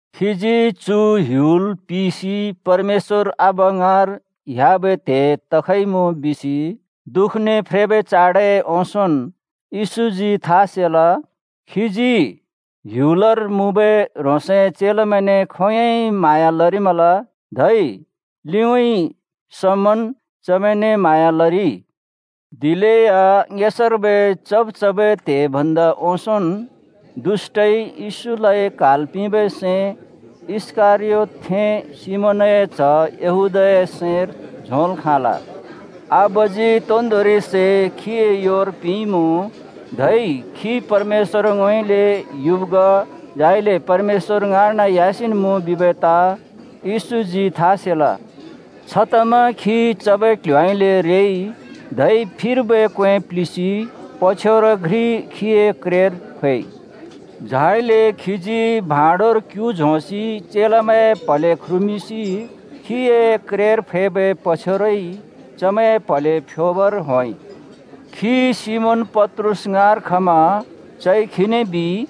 खीजी चु ह्‍युल पिसि परमेश्‍वर आबा ङाँर ह्‍याबै त्हे तखइमुँ बिसि दुःखने फ्रेबै चाडए ओंसोंन् येशूजी था सेल। खीजी ह्‍युलर मुँबै ह्रोंसए चेलामैंने खोंयोंइ म्हाँया लरिमल, धै लिउँइँ समन् चमैंने म्हाँया लरिइ। दिलेया ङेसार्बै चब् चबै त्हे भन्दा ओंसोंन् दुष्‍टइ येशूलाइ क्हाल् पिंबै सैं इस्करयोतथें सिमोनए च्ह यहूदाए सैंर झोंल् खाँल। आबाजी तोन्दोंरि सै खीए योर पिंइँमुँ। धै खी परमेश्‍वरउँइँले युब् ग, झाइले परमेश्‍वर ङाँर्न ह्‍यासिन् मुँ बिबै ताँ येशूजी था सेल। छतमा खी चबै क्ल्ह्‍योउँइँले रेइ, धै फिर्बै क्वें प्लिसि पछ्यौर घ्रि खीए क्रेर फैइ। झाइले खीजी भाँडोर क्‍यु झोंसि चेलामैंए प्हले ख्रुमिंसि खीए क्रेर फैबै पछ्यौरइ चमैंए प्हले फ्‍योबर होंइ। खी सिमोन पत्रुस ङाँर खमा चइ खीने बिइ,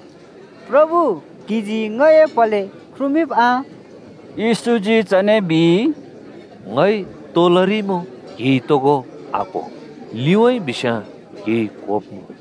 “प्रभु, क्‍हिजी ङए प्हले ख्रुमिंब् आ?” येशूजी चने बिइ, “ङइ तो लरिइमुँ क्‍हिइ तोगो आक्हो। लिउँइँ बिस्याँ क्हिइ क्‍होब्‍मुँ।”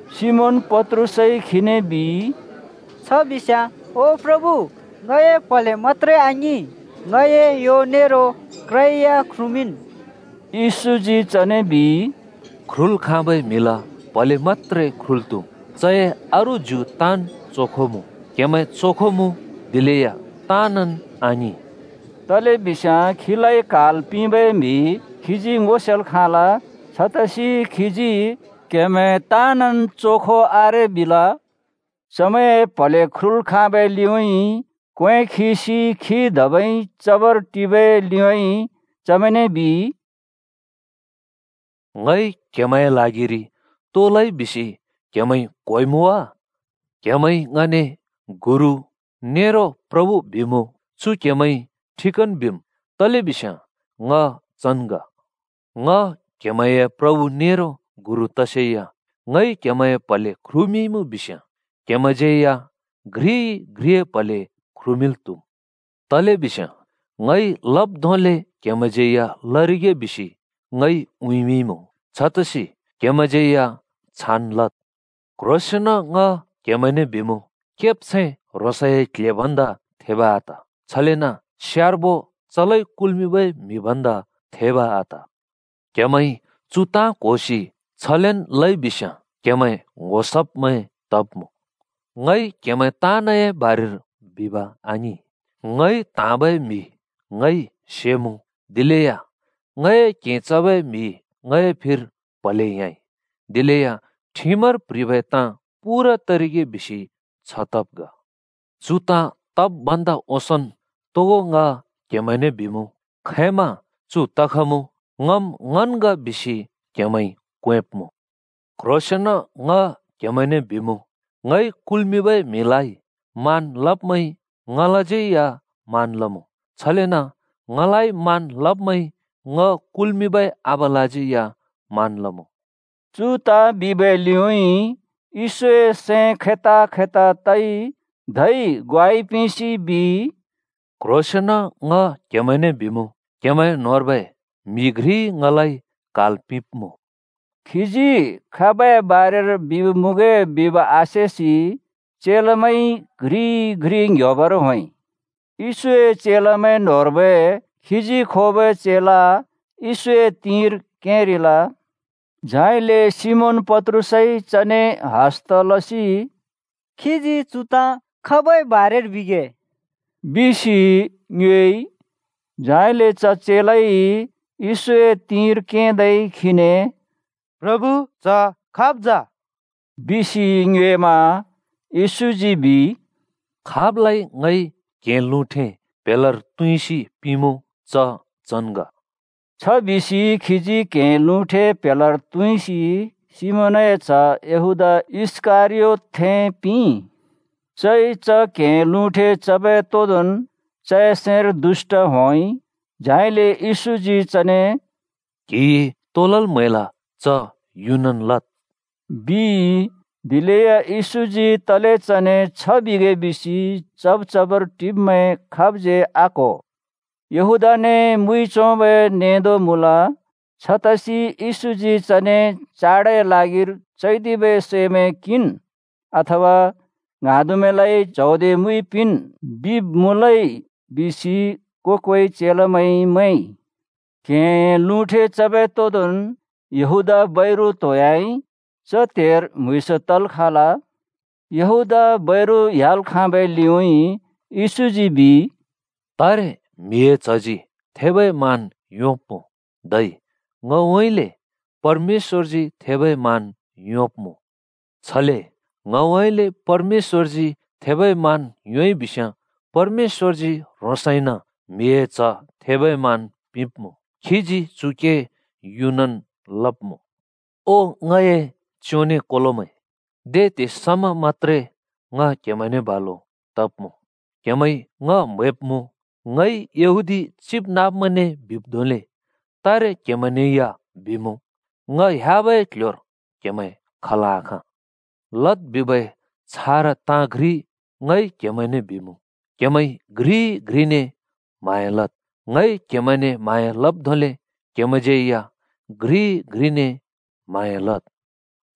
सिमोन पत्रुसइ खीने बिइ, “छ बिस्याँ ओ प्रभु, ङए प्‍हले मत्‍त्रे आङिं, ङए यो नेरो क्रया ख्रुमिंन्।” येशूजी चने बिइ, “ख्रुल् खाँबै म्हिला प्हले मत्‍त्रे ख्रुल् त्हुम्, चए अरू ज्यु ताँन् चोखो मुँ। क्हेमैं चोखो मुँ, दिलेया ताँनन् आङिं।” तलेबिस्याँ खीलाइ क्हाल् पिंबै म्हि खीजी ङो सेल् खाँल। छतसि खीजी, “क्हेमैं ताँनन् चोखो आरे,” बिल। चमैंए प्हले ख्रुल् खाँबै लिउँइँ क्वें खिसि खी धबै चबर टिबै लिउँइँ चमैंने बिइ, “ङइ क्हेमैंए ल्हागिरि तो लइ बिसि क्हेमैंइ क्होइमुँ वा? क्‍हेमैंइ ङने ‘गुरु’ नेरो ‘प्रभु’ बिमुँ। चु क्हमैंइ ठिकन् बिम्, तलेबिस्याँ ङ चन् ग। ङ क्‍हेमैंए प्रभु नेरो गुरु तसेया ङइ क्हेमैंए प्हले ख्रुमिंइँमुँ बिस्याँ क्हेमैंज्यै या घ्रिइ-घ्रिए प्हले ख्रुमिंल् त्हुम्। तलेबिस्याँ ङइ लब् धोंले क्‍हेमैंज्यै या लरिगे बिसि ङइ उँइँमिंइँमुँ। छतसि क्हेमैंज्यै या छान् लद्। क्ह्रोंसेंन ङ क्हेमैंने बिमुँ, केब्छैं ह्रोंसए क्ल्हे भन्दा थेब आत, छलेन स्यार्बो चलाइ कुल्मिंबै म्हि भन्दा थेब आत। क्‍हेमैंइ चु ताँ क्होसि छलेन् लइ बिस्याँ क्हेमैं ङ्‌हो सब्मैं तब्मुँ। “ङइ क्हेमैं ताँनए बारेर बिब् आङिं। ङइ त्हाँबै म्हि ङइ सेमुँ। दिलेया ‘ङए क्हें चबै म्हिइ ङए फिर प्हलेइ ह्‍याँइ’ दिलेया ठिमर प्ह्रिबै ताँ पूरा तरिगे बिसि छ तब् ग। चु ताँ तब् भन्दा ओंसोंन् तोगो ङ क्हेमैंने बिमुँ। खैंमा चु तखमुँ ‘ङम् ङन् ग’ बिसि क्हेमैंइ क्वेंब्मुँ। क्ह्रोंसेंन ङ क्हेमैंने बिमुँ, ङइ कुल्मिंबै म्हिलाइ मान लब्मैंइ ङलाज्यै या मान लमुँ, छलेन ङलाइ मान लब्मैंइ ङ कुल्मिंबै आबालाज्यै या मान लमुँ।” चु ताँ बिबै लिउइ येशूए सैं खैता-खैता तइ धै ग्वाइ पिंसि बिइ, “क्ह्रोंसेंन ङ क्हेमैंने बिमुँ, क्हेमैं न्होंर्बै म्हि घ्रिइ ङलाइ क्हाल् पिंब्मुँ।” खीजी खाबए बारेर बिब् मुँगे बिब आसेसि चेलामैंइ घ्रिइ-घ्रि ङ्‍ह्‍योबर होंइ। येशूए चेलामैं न्होंर्बै खीजी खोबै चेला येशूए तिंर केंरिल। झाइले सिमोन पत्रुसइ चने हस्‍ता लसि “खीजी चु ताँ खाबै बारेर बिगे? बिसि ङ्योएइ।” झाइले च चेलाइ येशूए तिंर केंदै खीने “प्रभु, च खाब् जा?” बिसि ङ्योएमा। येशूजी बिइ, “खाबलाइ ङइ क्हें लुँठे प्हेलार तुँइसि पिंमुँ, च चन् ग।” छ बिसि खीजी क्हें लुँठे प्हेलार तुँइसि सिमोनए च्‍ह यहूदा इस्‍करियोतथें पिंइ। चइ च क्हें लुँठे चबै तोदोंन् चए सैंर दुष्‍ट होंइ। झाइले येशूजी चने “क्‍हिइ तो लल् म्हैल, च युनन् लद्,” बिइ। दिलेया येशूजी तले चने छ बिगे बिसि चब् चबर टिब्मैं खाबज्यै आक्हो। यहूदाने मुइ झोंबै नेंदो मुँल। छतसि “येशूजी चने ‘चाडए ल्हागिर चैदिबै सैमैं किंन्’ अथवा ‘ङ्हाँदुमैंलाइ च्हौदे मुइ पिंन्,’ बिब् मुँलै,” बिसि को-कोइ चेलामैंइ मैंइ। क्हेंए लुँठे चबै तोदोंन् यहूदा बैरु त्होंयाइ। च त्हेर म्हुँइँस तल् खाँल। यहूदा बैरु ह्‍याल् खाँबै लिउँइँ येशूजी बिइ, “तारे म्हिए च्हजी थेबै मान योंब्मुँ, धै ङउँइँले परमेश्‍वरजी थेबै मान योंब्मुँ। छले ङउँइँले परमेश्‍वरजी थेबै मान योंइबिस्याँ परमेश्‍वरजी ह्रोंसइन म्हिए च्ह थेबै मान पिंब्मुँ, खीजी चु के युनन् लब्मुँ। “ओ ङए च्योंनें कोलोमैं, दे त्हे समा मत्‍त्रे ङ क्हेमैंने बालु तब्मुँ! क्हेमैंइ ङ म्हैब्मुँ, ङइ यहूदी चिबनाँब्मैंने बिब् धोंले तारे क्हेमैंने या बिमुँ, ङ ह्‍याबै क्ल्ह्‍योर क्हेमैं खल् आखाँ। लद् बिबै छारा ताँ घ्रि ङइ क्हेमैंने बिमुँ: क्हेमैंइ घ्रिइ-घ्रिने म्हाँया लद्। ङइ क्हेमैंने म्हाँया लब् धोंले क्हेमैंज्यै या घ्रिइ-घ्रिने म्हाँया लद्।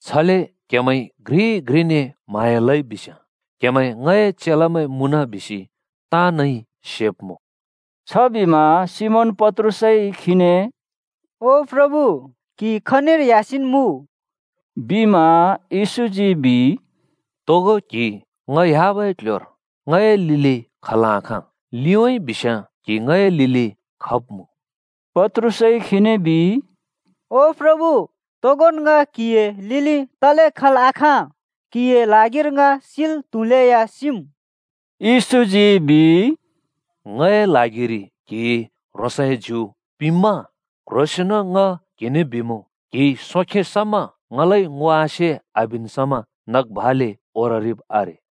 छले क्हेमैंइ घ्रिइ-घ्रिने म्हाँया लइ बिस्याँ, क्हेमैं ङए चेलामैं मुँन बिसि ताँनइ सेब्मुँ।” छबिमा सिमोन पत्रुसइ खीने “ओ प्रभु, क्‍हि खनिर ह्‍यासिन् मुँ?” बिमा। येशूजी बिइ, “तोगो क्हि ङ ह्‍याबै क्ल्ह्‍योर ङए लिलि खल् आखाँ। लिउँइँ बिस्याँ क्हि ङए लिलि खब्मुँ।” पत्रुसइ खीने बिइ, “ओ प्रभु, तोगोन ङ क्‍हिए लिलि तले खल् आखाँ? क्‍हिए ल्हागिर ङ सिल् त्हुलेया सिम्।” येशूजी बिइ, “ङए ल्हागिरि क्हिइ ह्रोंसए ज्यु पिंम्मा? क्ह्रोंसेंन ङ क्हिने बिमुँ, क्‍हिइ सोंखे समा ङलाइ ङो आसे आबिन् समा नग भाले ओररिब् आरे।